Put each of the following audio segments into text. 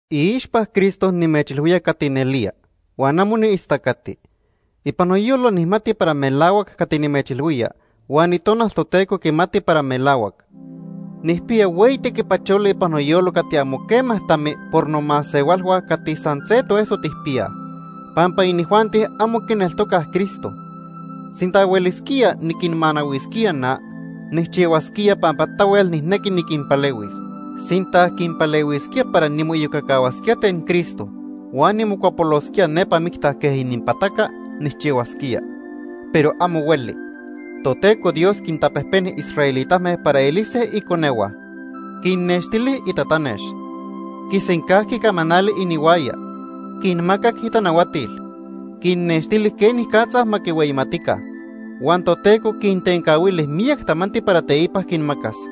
Iixpa Cristo nimechilhuía cati nelía, huan amo niistacati. Ipan noyolo nijmati para melahuac cati nimechilhuía huan Itonal Toteco quimati para melahuac. Nijpiya hueyi tequipacholi ipan noyolo cati amo quema tami por nomasehualhua cati san se toeso tijpiyaj, pampa inijuanti amo quineltocaj Cristo. Sinta huelisquía niquinmanahuisquía na, nijchihuasquía pampa tahuel nijnequi niquinpalehuis. Sinta quinpalehuisquía para nimoiyocacahuasquía ten Cristo huan nimocuapolosquía nepa micta quej ininpataca, nijchihuasquía. Pero amo hueli. Toteco Dios quintapejpeni israelitame para elise iconehua. Quinnextili itatanex. Quisencajqui camanali inihuaya. Quinmacac itanahuatil. Quinnextili quenicatza ma quihueyimatica. Huan Toteco quintencahuili miyac tamanti para teipa quinmacas.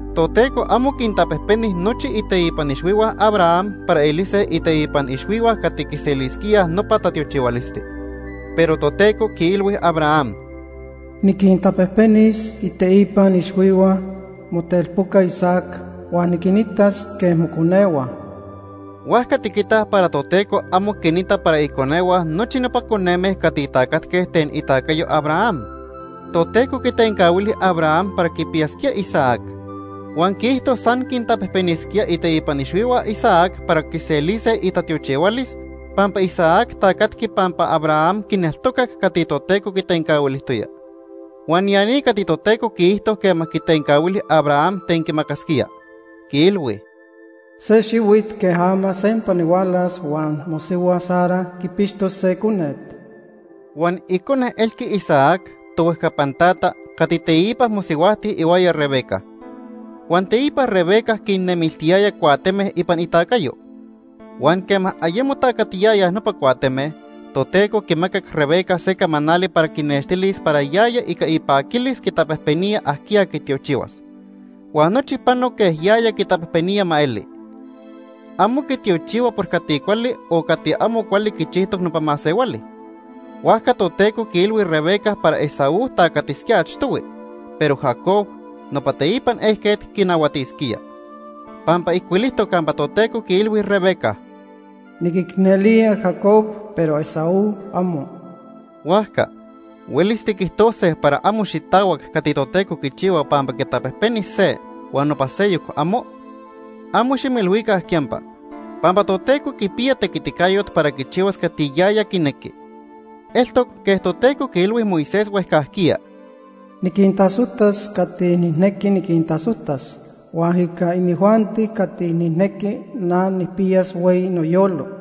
Toteco amo quintapejpeni nochi iteipan ixhuihua Abraham para elise iteipan ixhuihua cati quiselisquíaj nopa tatiochihualisti. Pero Toteco quiilhui Abraham: “Niquintapejpenis iteipan ixhuihua motelpoca Isaac huan niquinitas quej moconehua.” Huajca tiquitaj para Toteco amo quinita para iconehua nochi nopa coneme cati tacatque ten itacayo Abraham. Toteco quitencahuili Abraham para quipiyasquía Isaac. Huan quiijto san quintapejpenisquía iteipan ixhuihua Isaac para quiselise itatiochihualis pampa Isaac tacatqui pampa Abraham quineltocac cati Toteco quitencahuilijtoya. Huan ya ni cati Toteco quiijto quema quitencahuili Abraham ten quimacasquía, quiilhui: “Se xihuit quej ama sempa nihualas huan mosihua Sara quipixtos se conet.” Huan icone elqui Isaac, tohuejcapan tata, cati teipa mosihuajti ihuaya Rebeca. Huan teipa Rebeca quinnemiltiyaya cuateme ipan itacayo. Huan quema ayemo tacatiyayaj nopa cuateme, Toteco quimacac Rebeca se camanali para quinextilis para yaya ica ipaquilis quitapejpenía ajquiya quitiochihuas, huan nochi pano quej yaya quitapejpenía ma eli. Amo quitiochihua por cati cuali o amo cuali quichijtoc nopa masehuali. Huajca Toteco quiilhui Rebeca para Esaú tacatisquía achtohui, pero Jacob, nopa teipan ejquet, quinahuatisquía. Pampa ijcuilijtoc campa Toteco quiilhui Rebeca: “Niquicnelía Jacob, pero Esaú, amo.” Huajca ¿huelis tiquijtose para amo xitahuac cati Toteco quichihua pampa quitapejpeni se huan nopa seyoc, amo? Amo ximoilhuica quiyampa. Pampa Toteco quipiya tequiticayot para quichihuas cati yaya quinequi. Eltoc quej Toteco quiilhui Moisés huejcajquiya: “Niquintasojtas cati nijnequi niquintasojtas, huan ica inijuanti cati nijnequi, na nijpiyas hueyi noyolo.”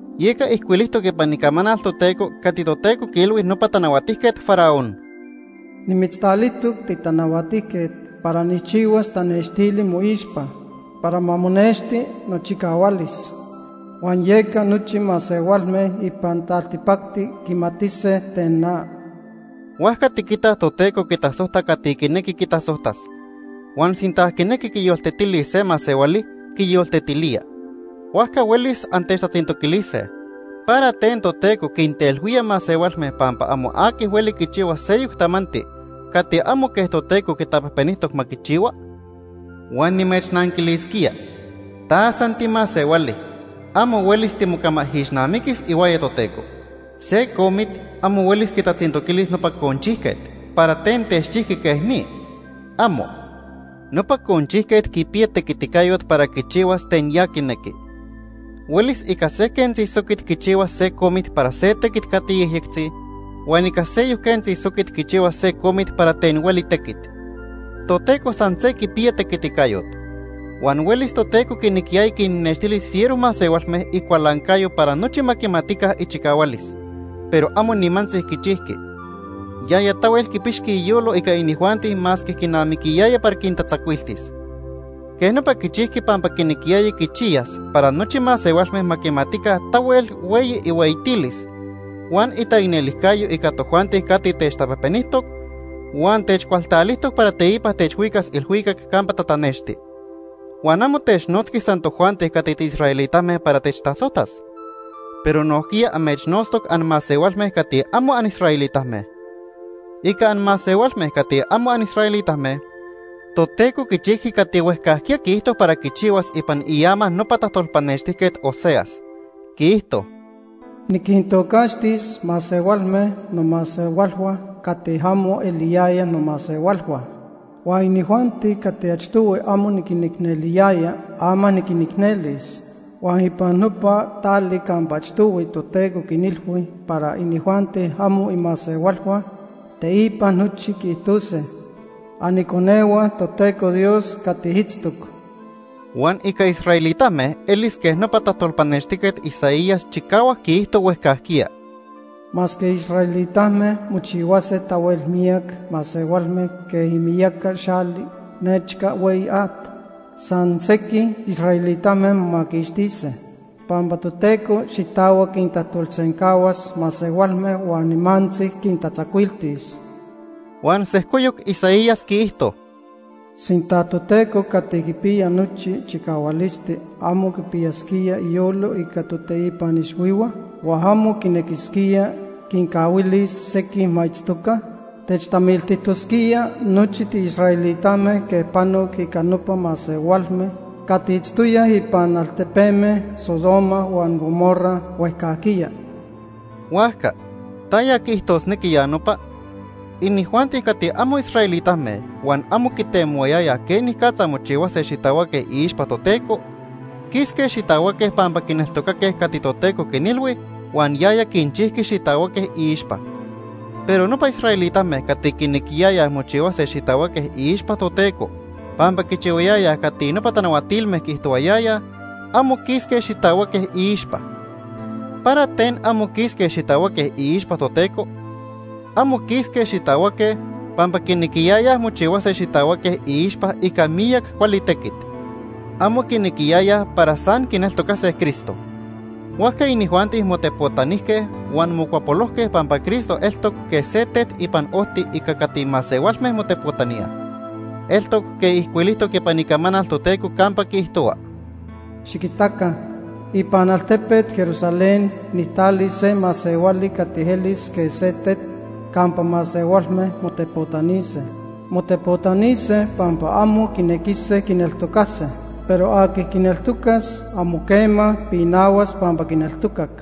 Yeca ijcuilijtoc ipan Icamanal Toteco cati Toteco quiilhui nopa Tanahuatijquet Faraón: “Nimitztalijtoc titanahuatijquet para nijchihuas tanextili moixpa para ma monexti nochicahualis huan yeca nochi masehualme ipan taltipacti quimatise ten na.” Huajca tiquitaj Toteco quitasojta cati quinequi quitasojtas. Huan sinta quinequi quiyoltetilis se masehuali, quiyoltetilía. Huajca huelis antechtatzintoquilise: “¿Para ten Toteco quintelhuía masehualme pampa amo aqui hueli quichihua seyoc tamanti cati amo quej Toteco quitapejpenijtoc ma quichihua?” Huan nimechnanquilisquía: “Ta san timasehuali. Amo huelis timocamaijixnamiquis ihuaya Toteco.” Se comit amo huelis quitatzintoquilis nopa conchijquet, ¿para ten techchijqui quej ni? ¡Amo! Nopa conchijquet quipiya tequiticayot para quichihuas ten ya quinequi. Huelis ica se quentzi soquit quichihuas se comit para se tequit cati yejyectzi huan ica seyoc quentzi soquit quichihuas se comit para ten hueli tequit. Toteco san se quipiya tequiticayot. Huan huelis Toteco quinequiyaya quinnextilis fiero masehualme icualancayo para nochi ma quimatica ichicahualis, pero amo nimantzi quichijqui. Yaya tahuel quipixqui iyolo ica inijuanti masque quinamiquiyaya para quintatzacuiltis. Quej nopa quichijqui pampa quinequiyaya quichiyas para nochi masehualme ma quimatica tahuel hueyi ihueyitilis, huan itaicnelijcayo ica tojuanti cati techtapejpenijtoc, huan techcualtalijtoc para teipa techhuicas ilhuicac campa tatanexti. Huan amo technotzqui san tojuanti cati tiisraelitame para techtasojtas, pero nojquiya amechnotztoc anmasehualme cati amo anisraelitame. Ica anmasehualme cati amo anisraelitame, Toteco quichijqui cati huejcajquiya quiijto para quichihua ipan iama nopa tajtolpanextijquet Oseas. Quiijto: “Niquintocaxtis masehualme nomasehualhua cati amo eliyayaj nomasehualhua. Huan inijuanti cati achtohui amo niquinicneliyaya, ama niquinicnelis. Huan ipan nopa tali campa achtohui Toteco quinilhui para inijuanti amo imasehualhua, teipa nochi quiijtose: ‘Aniconehua Toteco Dios cati itztoc.’” Huan ica israelitame elis quej nopa tajtolpanextijquet Isaías chicahuac quiijto huejcajquiya: “Masque israelitame mochihuase tahuel miyac masehualme quej imiyaca xali nechca hueyi at, san sequij israelitame momaquixtise. Pampa Toteco xitahuac quintajtolsencahuas masehualme huan nimantzi quintatzacuiltis.” Huan sejcoyoc Isaías quiijto: “Sinta Toteco cati quipiya nochi chicahualisti amo quipiyasquía iyolo ica toteipan ixhuihua, huan amo quinequisquía quincahuilis sequij ma itztoca, techtamiltijtosquía nochi tiisraelitame quej panoc ica nopa masehualme cati itztoyaj ipan altepeme Sodoma huan Gomorra huejcajquiya.” Huajca ¿taya quiijtosnequi ya nopa? Inijuanti cati amo israelitame huan amo quitemohuayayaj quenicatza mochihuase xitahuaque iixpa Toteco, quisque xitahuaque pampa quineltocaque cati Toteco quinilhui huan yaya quinchijqui xitahuaque iixpa. Pero nopa israelitame cati quinequiyayaj mochihuase xitahuaque iixpa Toteco pampa quichihuayayaj cati nopa tanahuatilme quiijtohuayaya, amo quisque xitahuaque iixpa. ¿Para ten amo quisque xitahuaque iixpa Toteco? Amo quisque xitahuaque pampa quinequiyayaj mochihuase xitahuaque iixpa ica miyac cuali tequit. Amo quinequiyayaj para san quineltocase Cristo. Huajca inijuanti motepotanijque huan mocuapolojque pampa Cristo eltoc quej se tet ipan ojti ica cati masehualme motepotaníaj. Eltoc quej ijcuilijtoc ipan Icamanal Toteco campa quiijtohua: “Xiquitaca, ipan altepet Jerusalén Altepet Jerusalén nojquiya itoca Sion. nijtalis se masehuali cati elis quej se tet campa masehualme motepotanise. Motepotanise pampa amo quinequise quineltocase, pero aqui quineltocas amo quema pinahuas pampa quineltocac.”